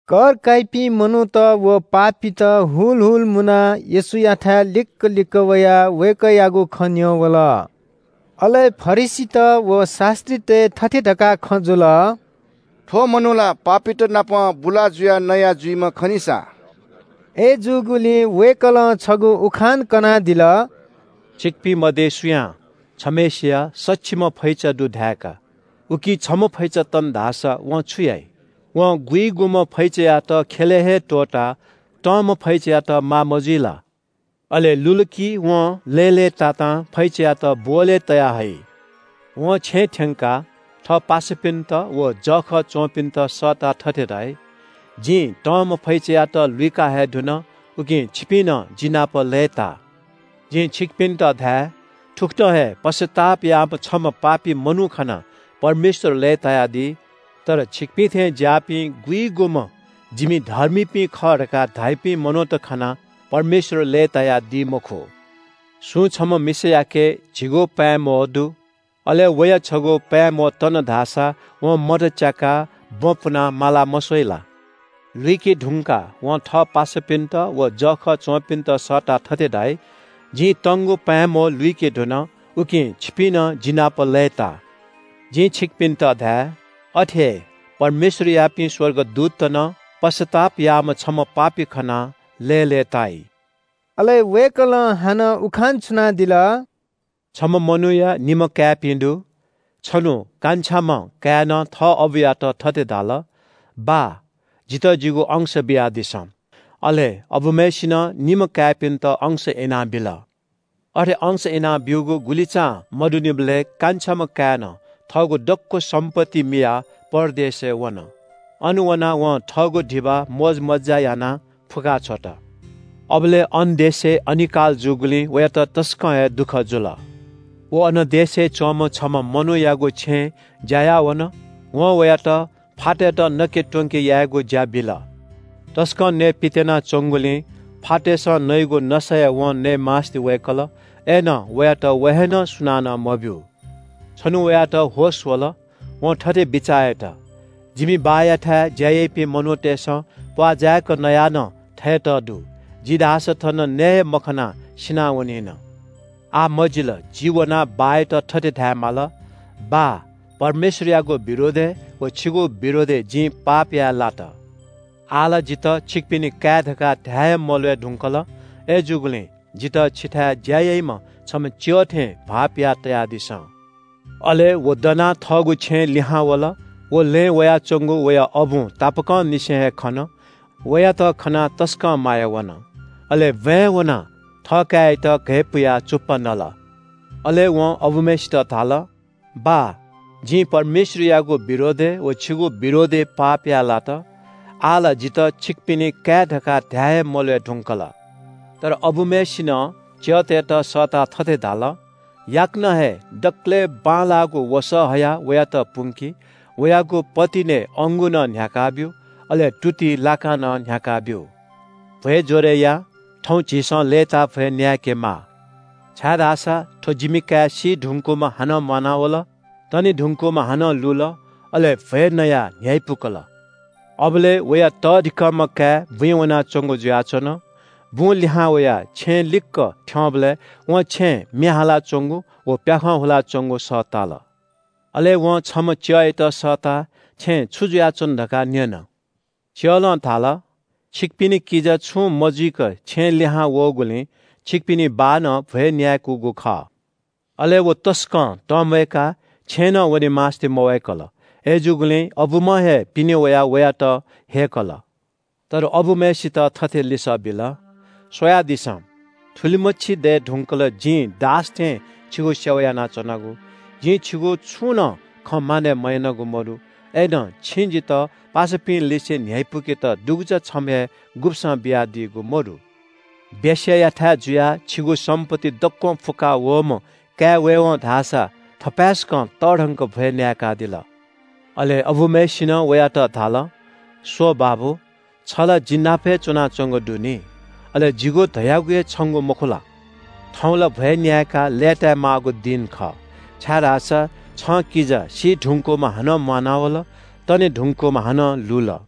कर काइपिं मनूत व पापीत हुल हुल मुनाः येशूयाथाय् लिक्‍क लिक्‍क वयाः वय्‌कःयागु खँ न्‍यं वल। अले फरिसीत व शास्‍त्रीतय् थथे धकाः खँ जुल – “थ्‍व मनू ला पापीत नाप बुला जुयाः नया जुइम्‍ह खनिसा।” अय्‌जूगुलिं वय्‌कलं छगू उखान कनादिल। “छिकपिं मध्‍ये सुयां छम्‍हय्‌सिया सछिम्‍ह फैचा दु धाय्‌का। उकी छम्‍ह फैचा तन धाःसा वं छु याइ? वं गुइगुम्‍ह फैचायात ख्‍यलय् हे त्‍वःताः तंम्‍ह फैचायात माः मजुइ ला? अले लुल कि वं लय्‌लय्‌तातां फैचायात ब्‍वहलय् तयाः हइ। वं छेँ थ्‍यंकाः थः पासापिन्‍त व जःखः च्‍वंपिन्‍त सःताः थथे धाइ – ‘जिं तंम्‍ह फैचायात लुइका हये धुन, उकिं छिपिं नं जिनापं लय्‌ता।’ जिं छिकपिन्‍त धाये – थुकथं हे पश्‍चाताप याःम्‍ह छम्‍ह पापी मनू खनाः परमेश्‍वर लय्‌तायादी। तर छिकपिं थें ज्‍याःपिं गुइगुम्‍ह ‘जिपिं धर्मीपिं खः’ धकाः धाइपिं मनूत खनाः परमेश्‍वर लय्‌तायादी मखु।” “सुं छम्‍ह मिसायाके झिगू पाँय् म्‍वहः दु। अले वया छगू पाँय् म्‍वहः तन धाःसा वं मत च्‍याकाः बँ पुनाः मालाः मस्‍वइ ला? लुइके धुंकाः वं थः पासापिन्‍त व जःखः च्‍वंपिन्‍त सःताः थथे धाइ – ‘जिं तंगु पाँय् म्‍वहः लुइके धुन, उकिं छिपिं नं जिनापं लय्‌ता।’ जिं छिकपिन्‍त धाये – अथे हे परमेश्‍वरयापिं स्‍वर्गदूतत नं पश्‍चाताप याःम्‍ह छम्‍ह पापी खनाः लय्‌लय्‌ताइ।” अले वय्‌कलं हानं उखान छुनादिल – “छम्‍ह मनूया निम्‍ह काय्‌पिं दु। छन्‍हु कान्छाम्‍ह काय्‌नं थः अबुयात थथे धाल – ‘बाः, जितः जिगु अंश बियादिसँ।’ अले अबुम्‍हय्‌सिनं निम्‍ह काय्‌पिन्‍त अंश इनाबिल। “अथे अंश इनाब्‍यूगु गुलिचां मदुनिबलय् कान्छाम्‍ह काय्‌नं थःगु दक्‍व सम्‍पत्ति मियाः परदेशय् वन। अन वनाः वं थःगु धिबा मोजमज्‍जा यानाः फुक्‍का छ्वत। अबलय् अन देशय् अनिकाल जूगुलिं वयात तसकं हे दुःख जुल। व अन देशय् च्‍वंम्‍ह छम्‍ह मनूयागु छेँय् ज्‍या याः वन। वं वयात फातय्‌त नके त्‍वंके यायेगु ज्‍या बिल। तसकं नयेपित्‍यानाः च्‍वंगुलिं फातय्‌सं नइगु नसा हे वं नये मास्‍ति वय्‌कल, अय्‌नं वयात व हे नं सुनानं मब्‍यू। “छन्‍हु वयात होश वल, वं थथे बिचाः यात – ‘जिमि बाःयाथाय् ज्‍या याइपिं मनूतय्‌सं प्‍वाः जाय्‌क नयाः नं थयेत दु, जि धाःसा थन नये हे मखनाः सिनावनिन। आः मजिल, जि वनाः बाःयात थथे धायेमाल – “बाः, परमेश्‍वरयागु विरोधय् व छिगु विरोधय् जिं पाप याये लात। आः ला जितः छिकपिनि काय् धकाः धाये हे मल्‍वय् धुंकल। अय्‌जूगुलिं जितः छिथाय् ज्‍या याइम्‍ह छम्‍ह च्‍यः थें भाःपिया तयादिसँ।”’ “अले व दनाः थःगु छेँय् लिहां वल। व लँय् वयाच्‍वंगु वया अबुं तापाकंनिसें हे खन। वयात खनाः तसकं माया वन। अले ब्‍वाँय् वनाः थःकाय्‌यात घय्‌पुयाः चुप्‍पा नल। अले वं अबुम्‍हय्‌सित धाल – ‘बाः, जिं परमेश्‍वरयागु विरोधय् व छिगु विरोधय् पाप याये लात। आः ला जितः छिकपिनि काय् धकाः धाये हे मल्‍वय् धुंकल।’ “तर अबुम्‍हय्‌सिनं च्‍यःतय्‌त सःताः थथे धाल – ‘याकनं हे दकलय् बांलाःगु वसः हयाः वयात पुंकि। वयागु पतिनय् अंगू नं न्‍ह्याकाः ब्‍यु। अले तुतिइ लाकां नं न्‍ह्याकाः ब्‍यु। भ्‍वय् ज्‍वरय् या। थौं झीसं लय्‌ताः भ्‍वय् न्‍याय्‌केमाः, छाय्‌धाःसा थ्‍व जिमि काय् सी धुकूम्‍ह हानं म्‍वानावल, तने धुंकूम्‍ह हानं लुल।’ अले भ्‍वय् नयाः न्‍ह्यइपुकल।” “अबलय् वया तःधिकःम्‍ह काय् बुँइ वनाच्‍वंगु जुयाच्‍वन। बुं लिहां वयाः छेँ लिक्‍क थ्‍यंबलय् वं छेँय् म्‍ये हालाच्‍वंगु व प्‍याखं ल्‍हुयाच्‍वंगु सः ताल। अले वं छम्‍ह च्‍यःयात सःताः छेँय् छु जुयाच्‍वन धकाः न्‍यन। च्‍यलं धाल – ‘छिकपिनि किजा छुं मजुइक छेँय् लिहां वःगुलिं छिकपिनि बाःनं भ्‍वय् न्‍याय्‌कूगु खः।’ “अले व तसकं तंम्‍वय्‌काः छेँय् नं वने मास्‍ति मवय्‌कल। अय्‌जूगुलिं अबुम्‍हं हे पिने वयाः वयात ह्यय्‌कल। तर अबुम्‍हय्‌सित थथे लिसः बिल – ‘स्‍वयादिसँ, थुलिमछि दये धुंकल जिं दास थें छिगु सेवा यानाच्‍वनागु। जिं छिगु छुं नं खँ मानय् मयानागु मदु। अय्‌नं छिं जितः पासापिंलिसे न्‍ह्यइपुकेत दुगुचा छम्‍ह हे गुब्‍सं बियादीगु मदु। वेश्‍यायाथाय् जुयाः छिगु सम्‍पत्ति दक्‍वं फुक्‍का वःम्‍ह काय् वयेवं धाःसा थपाय्‌सकं तःधंक भ्‍वय् न्‍याय्‌कादिल।’ “अले अबुम्‍हय्‌सिनं वयात धाल – ‘स्‍व बाबु, छ ला जि नाप हे च्‍वनाच्‍वंगु दु नि। अले जिगु धयागु हे छंगु मखु ला? थौं ला भ्‍वय् न्‍याय्‌काः लय्‌ताय् माःगु दिं खः, छाय्‌धाःसा छं किजा सी धुंकूम्‍ह हानं म्‍वानावल, तने धुंकूम्‍ह हानं लुल।’”